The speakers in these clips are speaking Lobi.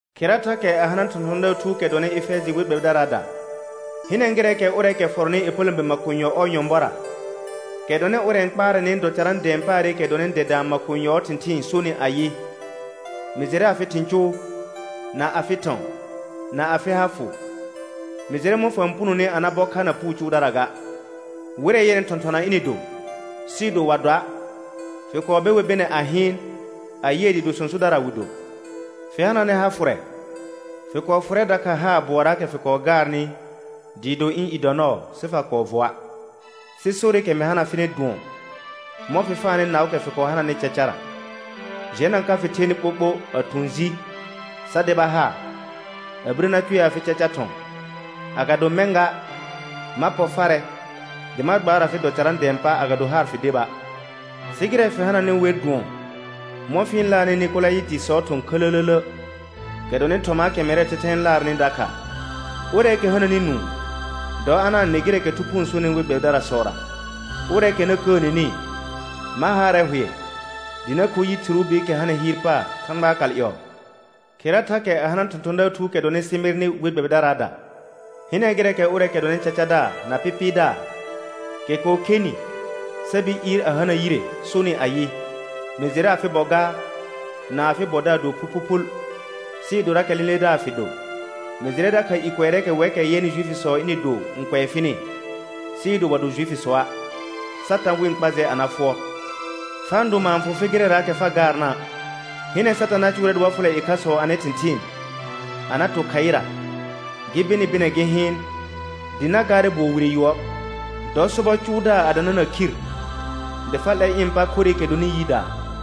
Khera thakɛ a hana thɔ̃thɔ̃daar thuukɛ dɔnɩ Efɛjɩ we gbɛbɩdaraada. Hɩnɛ gɩrɛɛkɛ ʋrɛɛkɛ fɔrɔnɩ ƴepələ̃be makonyɔ ɔɔ nyɔ̃bɔra, kɛ dɔnɩ ʋrɛ n kpaarɛnɩ dɔ carã dɛ̃ɛ paarɩkɛ dɔnɩ dɛdaa makonyɔɔ thɩ̃thɩɩn sonɩ ayɩ: Mɩ jɩrɛ afɩ thɩ̃ cʋʋ, na afɩ thɔ̃, na afɩ ha fʋ. Mɩ jɩrɛ mɔ̃ fa-n punoni a na bɔ kha na puu cʋʋdara ga. Wɩrɛ yɛnɩ thɔ̃thɔna ɩnɩ do sɩɩ do wa doa', fɩ kɔɔ be wer bɩnɛ a hɩɩn a yɩɛ dɩɩ do sõsodara wɩ do. Fɩ hananɛ ha fʋrɛ, fɩ kɔɔ fʋrɛ dakha haar bʋɔraakɛ fɩ kɔɔ gaarnɩ dɩɩ do ɩ̃ i dɔ nɔɔ sɩ fa kɔɔ vɔa'. Sɩ sorɩkɛ mɩ hana fɩnɩ dʋɔn mɔ̃ fɩ faanɩ naʋʋkɛ fɩ kɔɔ hananɩ cacara. Jɛna ka fɩ thenɩ ɓoɓo a thʋ̃ ji sa deba haar, a birə na cʋɛ afɩ caca thɔ̃, agado mɛ̃ ga, ma pɔ farɛ dɩ ma gbaar afɩ dɔ carã dɛ̃ɛ pa, agado haar fɩ deba'. Sɩ gɩrɛ fɩ hananɩ wer dʋɔn mɔ̃ fɩ-n laarnɩ Nɩkolayɩtɩsɔɔ thɔ̃ khələlələ, kɛ dɔnɩ thɔmaakɛ mɛrɛɛ thɛthɛ n laarnɩ dakha. Ʋrɛɛkɛ hananɩ nũu, dɔ a na-n nɩ gɩrɛɛkɛ Thu Phuu n sonɩ we gbɛbɩdarasɔra. Ʋrɛɛkɛ na kəəneni, ma haarɛ hʋɛ dɩ na kho yi thɩrʋʋ biikɛ hanɩ hɩɩr paar Thãgbaa kal ƴɔɔ. Khera thakɛ a hana thɔ̃thɔ̃daar thuukɛ dɔnɩ Sɩmɩrnɩ we gbɛbɩdaraada. Hɩnɛ gɩrɛɛkɛ ʋrɛɛkɛ dɔnɩ cacadaar na pɩpɩɩdaar, kɛ kɔɔ khenɩ sa bir ɩɩr a hana yire sonɩ ayɩ: Mɩ jɩrɛ afɩ bɔ gaar na afɩ bɔdaar do phuphuphul, sɩɩ dorakɛ lẽledaar fɩ do. Mɩ jɩrɛ dakha i kʋɛrɛɛkɛ wɛkɛ yɛnɩ Juifisɔ ɩnɩ do n kʋɛ fɩnɩ, sɩɩ do wa do Juifisɔa', Satã wɩ-n kpa jɛ a na fʋɔr. Fa-n do maar n fʋ fɩ gɩrɛraakɛ fa gaarna'. Hɩnɛ Satã na cʋʋrɛ dɩ wa fʋlɛ ɩkhasɔ anɩ thɩ̃thɩɩn a na to khaɩra gɩ be nɩ bɩnɛ gɩ hɩɩn, dɩ na gaarɛ bʋɔ wire yʋɔr. Dɔ sobɔ cʋʋdaar a danana khir dɩ fa 'lɛr ɩ̃ pa khorɩkɛ dɔnɩ yidaa.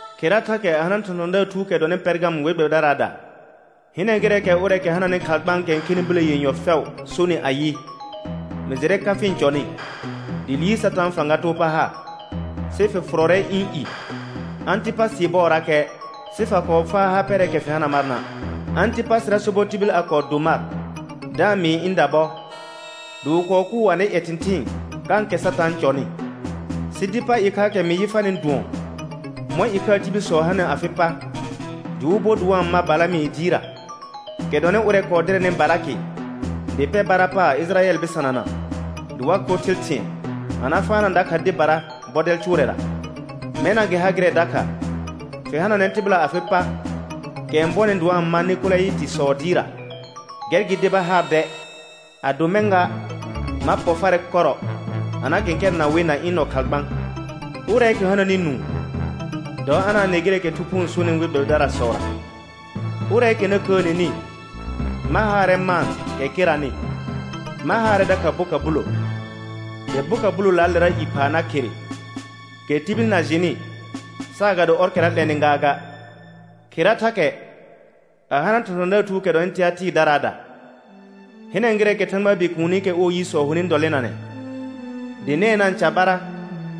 Khera thakɛ a hana thɔ̃thɔ̃daar thuukɛ dɔnɩ Pɛrgam we gbɛbɩdaraada. Hinɛ gɩrɛɛkɛ ʋrɛɛkɛ hananɩ khalgbãakɛ n khɛnɩ bilə yenyɔ fɛʋ sonɩ ayɩ: Mɩ jɩrɛ ka fɩ-n cɔnɩ, dɩ liir Satãa fãga too pa ha, sɩ fɩ fʋrɔrɛ ɩ̃ i. Ãtɩpasɩɩ bɔɔrakɛ, sɩ fa kɔɔ faa ha pɛrɛɛkɛ fɩ hana marna'. Ãtɩpasɩra sobɔ tibil a kɔɔ do mar da-n mɩɩ ɩ̃ dabɔ, dɩ wɩ kɔɔ kʋʋ anɩ ƴɛ thɩ̃thɩɩn kãkɛ Satã n cɔnɩ. Sɩ dɩ pa ɩkhaakɛ mɩ yɩ farnɩ dʋɔn mɔ̃ ɩkhaa tibilsɔ hanɩ afɩ pa, dɩ wɩ bo dɩ wa-n ma Balamɩ dɩɩrra, kɛ dɔnɩ ʋrɛ kɔɔ dɩrɛnɩ Balakɩ dɩ pɛr bara paar Ɩjɩrayɛl bɩsanana dɩ wa kho thɩl thɩ̃ɛ, a na faana dakha dɩbara bɔdɛl cʋʋrɛra. Mɛna gɩ ha gɩrɛ dakha, fɩ hananɛ tɩbɩla afɩ pa kɛ n bɔnɩ dɩ wa-n ma Nɩkolayɩtɩsɔɔ dɩɩrra. Gɛr gɩ deba haar dɛ, ado mɛ̃ ga, ma pɔ farɛ kɔrɔ a na kɛ̃kɛrɛna wɩ na ɩ̃ nɔ khalgbã. Ʋrɛɛkɛ hananɩ nũu, dɔ a na-n nɩ gɩrɛɛkɛ Thu Phuu n sonɩ we gbɛbɩdarasɔra. Ʋrɛɛkɛ na kəəneni ma haarɛ maan kɛ keranɩ, ma haarɛ dakha boka bulo, dɩ boka bulolaalera i phaa na khere, kɛ tibil na jɩnɩ saagado ɔrkɛra 'lɛnɩ gaaga. Khera thakɛ a hana thɔ̃thɔ̃daar thuukɛ dɔnɩ Tɩatɩɩrdaraada. Hɩnɛ gɩrɛɛkɛ Thãgbaa Bikuunikɛ ɔɔ yisɔ honɩ dɔlɩnanɛ, dɩ nɛɛ na-n carbara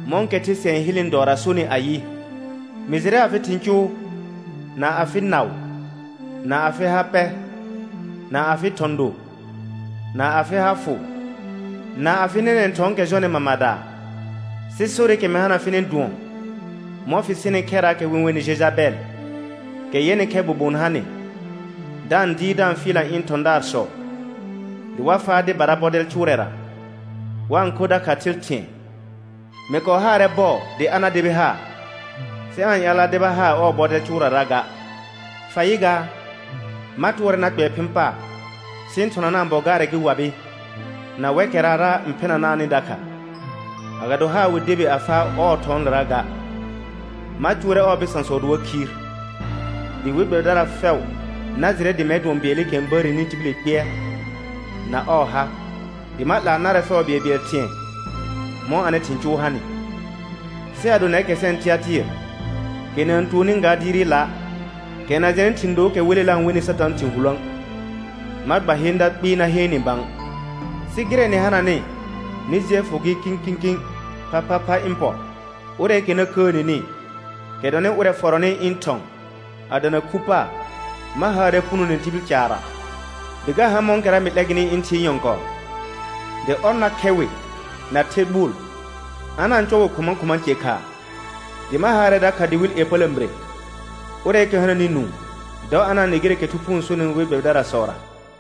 mɔ̃kɛ the sɩɛ n hɩlnɩ dɔɔra sonɩ ayɩ: Mɩ jɩrɛ afɩ thɩ̃ cʋʋ, na afɩ naʋ, na afɩ ha pɛ, na afɩ thɔ̃ do, na afɩ ha fʋ, na afɩ nɛnɛ̃ thɔ̃ɔkɛ jɔnɩ mamadaa. Sɩ sorɩkɛ mɩ hana fɩnɩ dʋɔn mɔ̃ fɩ sɩnɩ khɛrraakɛ wɩ-n wenɩ Jejabɛl, kɛ yɛnɩ khɛ bobon ha nɩ, da-n dɩɩr da-n fɩɩlna ɩ̃ thɔ̃daarsɔ dɩ wa faa dɩbara bɔdɛl cʋʋrɛra, wa-n kho dakha thɩl thɩ̃ɛ. Mɩ kɔɔ haarɛ bɔɔ dɩ a na debi haar, sɩ aa-n ƴaal a deba haar ɔɔ bɔdɛl cʋʋrara ga. Fa yɩ gaa, ma tʋɔrɛ na kpɛɛ phɩ̃ paar sɩ ɩ̃ thɔnanaa bɔ gaarɛ, gɩ wabɩ na wɛkɛrara n phɩnanaanɩ dakha. agado haar wɩ debi a faa ɔɔ thɔ̃ɔlera ga. Ma cʋʋrɛ ɔɔ bɩsãsɔ dɩ wa khiir, dɩ we gbɛbɩdara fɛʋ na jɩrɛ dɩ mɛr dʋɔn bɩɛlɩkɛ n bəəreni tibili kpɩɛr na ɔɔ ha, dɩ ma 'laa narɛ fɛʋ bɩɛlbɩɛl thɩ̃ɛ mɔ̃ anɩ thɩ̃ cʋʋ hanɩ. Sɩ ado nɛrkɛ sɛnɩ Tɩatɩɩr, kɛ na-n tuonni ga dɩɩrɩla', kɛ na jɛnɩ thɩ̃ dookɛ welela n wenɩ Satãa thɩ̃ hulõə', ma gba heenda kpɩɩ na heen nɩ bã; sɩ gɩrɛ nɩ hananɩ, nɩ jɩɛ fʋ gɩ kĩkĩkĩ phaphapha ɩ̃ pɔ. Ʋrɛɛkɛ na kəəneni, kɛ dɔnɩ ʋrɛ fɔrɔnɩ ɩ̃ thɔ̃ a dana khu paar, ma haarɛ punone tibil caarra, dɩ ga ha mɔ̃kɛra mɩ 'lɛ gɩnɩ ɩ̃ Thɩɩ nyɔ̃kɔɔ, dɩ «ɔr na khɛ wɩ na the gbʋʋl, a na-n cɔ wɩ khʋma khʋma ce khaa», dɩ ma haarɛ dakha dɩwɩl ƴepələ̃bire. Ʋrɛɛkɛ hananɩ nũu, dɔ a na-n nɩ gɩrɛɛkɛ Thu Phuu n sonɩ we gbɛbɩdarasɔra.